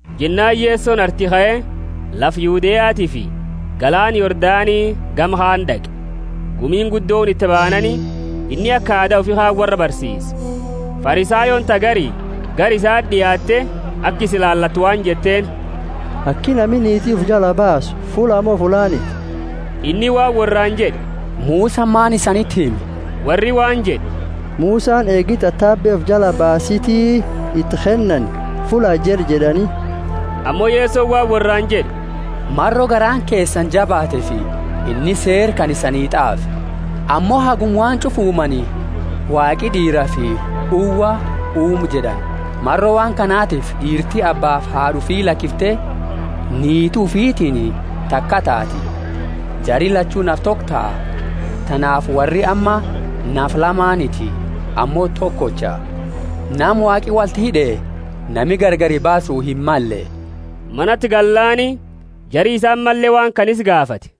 Jennaani Yesoni arti kae, lafa Yudeatiifi galaana Yordani gama kaani d'aqe. Gumiini guddooni iti baanaani, inni aka aada ufi kaani worra barsiise. Farisayooni ta gari gara isaa d'iaatte, aka isa ilaalattu waan jetteeni, Aki nami niiti ufi jala baasu fullaa mo fullaaniti? Inni waan worraani jed'e, Musani maani isaniti hime? Worri waan jed'e, Musani eegi tatabe ufi jala baasiti iti kennani fullaa jed'e jed'ani. Ammo Yesoni waan worraani jed'e, Maro garaani keesani jabaateefi inni seera kana isani t'aafe. Ammo haguma waan ch'ufa uumani, Waaqi d'iirafi uwa uume jed'ani. Maro waan kanatifi d'iirti abbaafi haad'a ufi lakifte, niiti ufitiini takaa taati; jari lachu nafa toko taha. Tanaafi worri amma nafa lamaaniti, ammo tokocha. Nama Waaqi wolti hid'e, nami gargari baasu himmalle. Manati gallaani, jari isaa ammalle waan kana isa gaafate.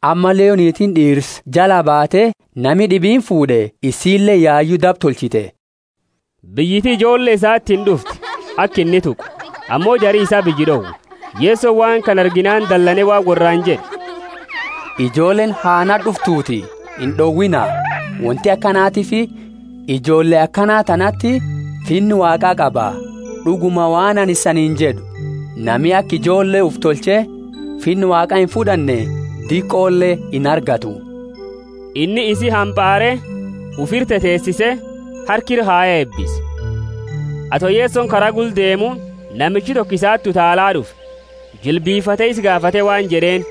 ammalle yo niitiini d'iirsa jalaa baate, nami d'ibiini fuud'e, isiileeni yayu daba tolchite. Biyyiti ijoolle isatiini d'ufte, aka inni tuqu, ammo jari isaa biyya d'owe. Yesoni waan kana arginaani dalane waan worraani jed'e, Ijoolleeni ha nati d'uftuuti, ind'owiina; wonti akanatiifi ijoolle akana tanati Finna Waaqa qaba. D'uguma, waan anini isaniini jed'u, Nami aka ijoolle ufi tolche Finna Waaqa imfud'anne diqole inargatu. Inni isi hampaare, ufira teteesise, harka ira kaye eebise. Ato Yesoni kara gula deemu, namichi toko isati utaala d'ufe, jilbifate isa gaafate waan jed'eeni,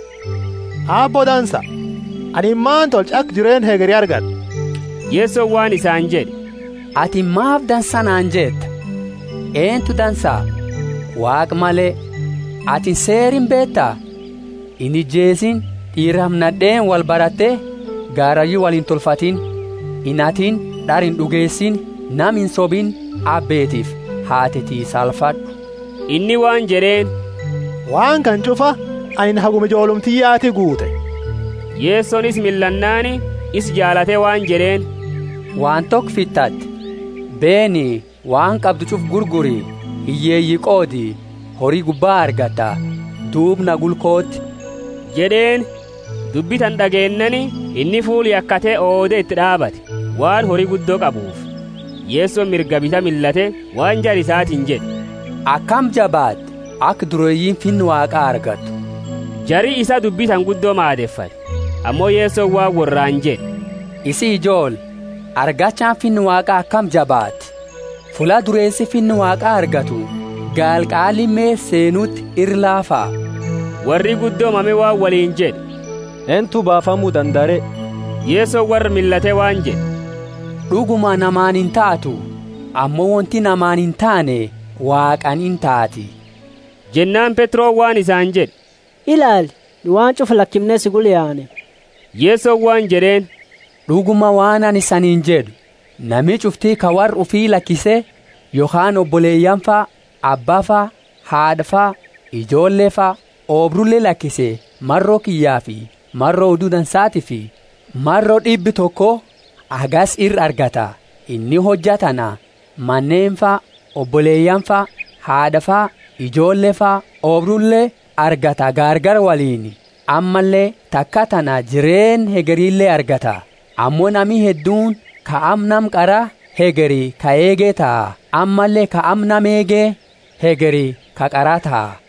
Aabbo dansa, anini maani tolcha aka jireenna hegeri argad'u? Yesoni waan isaani jed'e, Atini maafi dansa naani jetta? Eentu dansa, Waaqa male? Atini seera imbeeta: inijeesiini; d'iirafi nad'eeni wolbarate garayu wolintolfatini inhatiini; d'ara ind'ugeesiini; nama insobini; abbeetiifi haateti saalfad'u. Inni waan jed'eeni, Waan kana ch'ufa anini haguma ijoolluma tiyyati guute. Yesoni isa millannaani, isa jaalate waan jed'eeni, Waan toko fitate, beeni, waan qabdu ch'ufa gurguri, hiyyeeyi qoodi, hori gubba argatta, duuba na gula kooti jed'eeni. Dubbi tana d'ageennaani inni fuula yakate oode iti d'aabate, waan hori guddo qabuufi. Yesoni mirgaa bita millate, waan jara isaatiini jed'e, Akami jabaatti, aka dureeyiini Finna Waaqa argattu! Jari isaa dubbi tana guddo maadefate. Ammo Yesoni waan worraani jed'e, Isii ijoolle, argachaani Finna Waaqa akami jabaatti! Fulla dureesi Finna Waaqa argatu gaala qaa lime seenuti ira laafa. Worri guddo mame waan woliini jed'e, Eentu baafamu dandaa re? Yesoni worra millate waan jed'e, D'uguma namaani intaatu, ammo wonti namaani intaane Waaqaani intaati. Jennaani Petroni waan isaani jed'e, Ilaali, nu waan ch'ufa lakimne si gula yaane. Yesoni waan jed'eeni, D'uguma, waan anini isaniini jed'u, Nami ch'ufti ka worra ufi lakise, yokhaani oboleyaanifa, abbafa, haad'afa, ijoollefa, oobrule lakise, maro kiyyafi maro Odu Dansaatiifi, maro d'ibba toko hagasi ira argata. Inni hojja tana, maneenifa, oboleyaanifa, haad'afa, ijoollefa, oobrule, argata gaargala woliini, ammalle takaa tana jireenna hegerile argata. Ammo nami hedduuni ka amma nama qara, hegeri ka eege taha; ammalle ka amma nama eege, hegeri ka qara taha.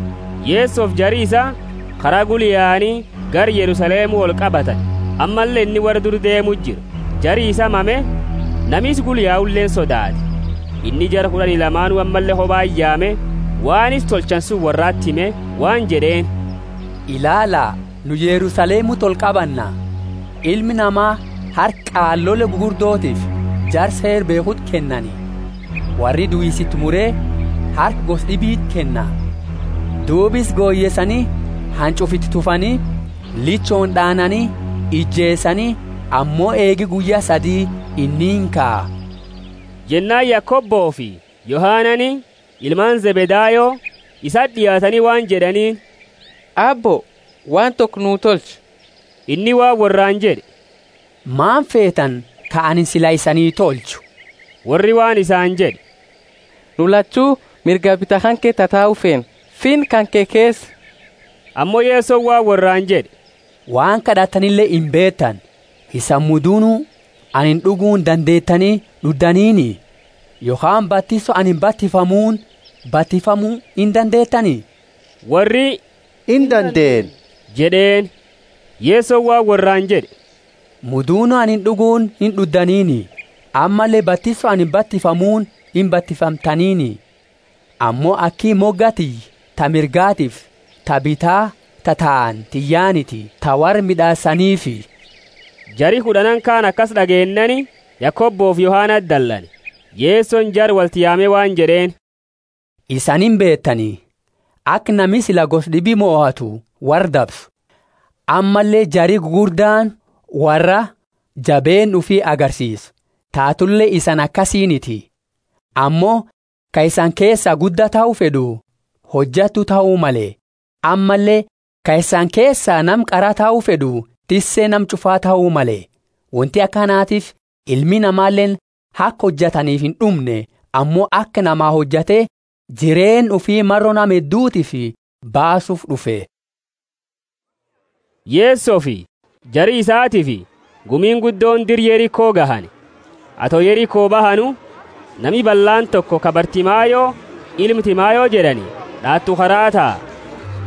Yesofi jari isaa kara gula yaani gara Yerusalemu olqabatani, ammalle inni worra dura deemu jira. Jari isaa mame; nami isa gula yauleeni sodaate. Inni jara kud'ani lamaanu ammalle kobati yaame, waan isa tolchani suni worrati hime, waan jed'eeni, Ilaala, nu Yerusalemuti olqabanna, Ilma Nama harka qaalole gugurdotiifi jara Seera beekhuti kennani. Worri duisa iti mure harka gosa d'ibiti kenna. Duuba isa goyeesani, hanch'ufa iti tufani, lichooni d'aanani, ijeesani, ammo eegi guyya sadi inni inkaa. Jennaani Yakobofi Yohanani, ilmaani Zebedayo, isati d'iaatani waan jed'aniini, Aabbo, waan toko nuu tolchi. Inni waan worraani jed'e, Maani feetani ka anini sila isani tolchu? Worri waan isaani jed'e, Nu lachu mirgaa bita kanke tatau feena, Finna kanke keesa. Ammo Yesoni waan worraani jed'e, Waan kad'attanile imbeetani. Isani mudunu anini d'uguuni dandeetani d'uddaniini? Yokhaani batiso anini batifamuuni batifamu indandeetani? Worri, Indandeenna jed'eeni. Yesoni waan worraani jed'e, Mudunu anini d'uguuni ind'uddaniini, ammalle batiso anini batifamuuni imbatifamtaniini; ammo aki moga tiyya ta mirgatiifi ta bita tataani tiyyaaniti, ta worra mid'aasaniifi. Jari kud'annaani kaani akasi d'ageennaani, Yakobofi Yohanati dalane. Yesoni jara wolti yaame waan jed'eeni, Isani imbeetani, aka nami sila gosa d'ibi mohatu worra dabsu, ammalle jari gugurdaani worraa jabeenna ufi agarsiisu. Taatule isani akasiiniti, ammo ka isani keesa gudda tahu fed'u, hojattu tahu male; ammalle ka isani keesa nama qara tahu fed'u tisse nama ch'ufa tahu male. Wonti akaatifi Ilmi Namaleeni aka hojataniifi ind'umne ammo aka namaa hojate, jireenna ufi maro nama heddutiifi baasuufi d'ufe. Yesofi jari isatiifi gumiini guddooni dira Yeriko gahani. Ato Yeriko bahanu, nami ballaani toko ka Bartimayo, ilma Timayo jed'ani d'aatu karaa taa.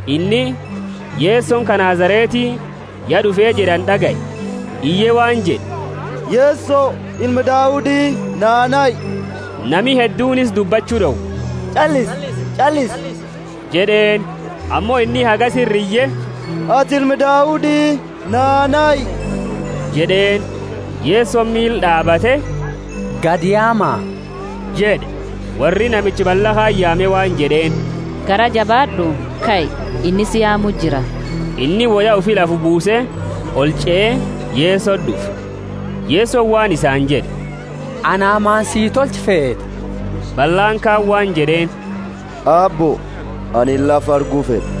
Inni, Yesoni ka Nazareti ya d'ufe jed'ani d'agaye, iye waan jed'e, Yeso, Ilma Daudi, naa nahi. Nami hedduuni isa dubbachu d'owe, Ch'allisi jed'eeni. Ammo inni hagasi ira iye, Ati Ilma Daudi, naa nahi jed'eeni. Yesoni miili d'aabate, Gadi yaama jed'e. Worri namicha balla kaani yaame waan jed'eeni, Garaa jabaad'u, kai, inni si yaamu jira. Inni woya ufi lafa buuse, olch'ee, Yesoti d'ufe. Yesoni waan isaani jed'e, Ana maani sii tolchu feeta? Ballaani kaani waan jed'eeni, Aabbo, anini lafa argu fed'a.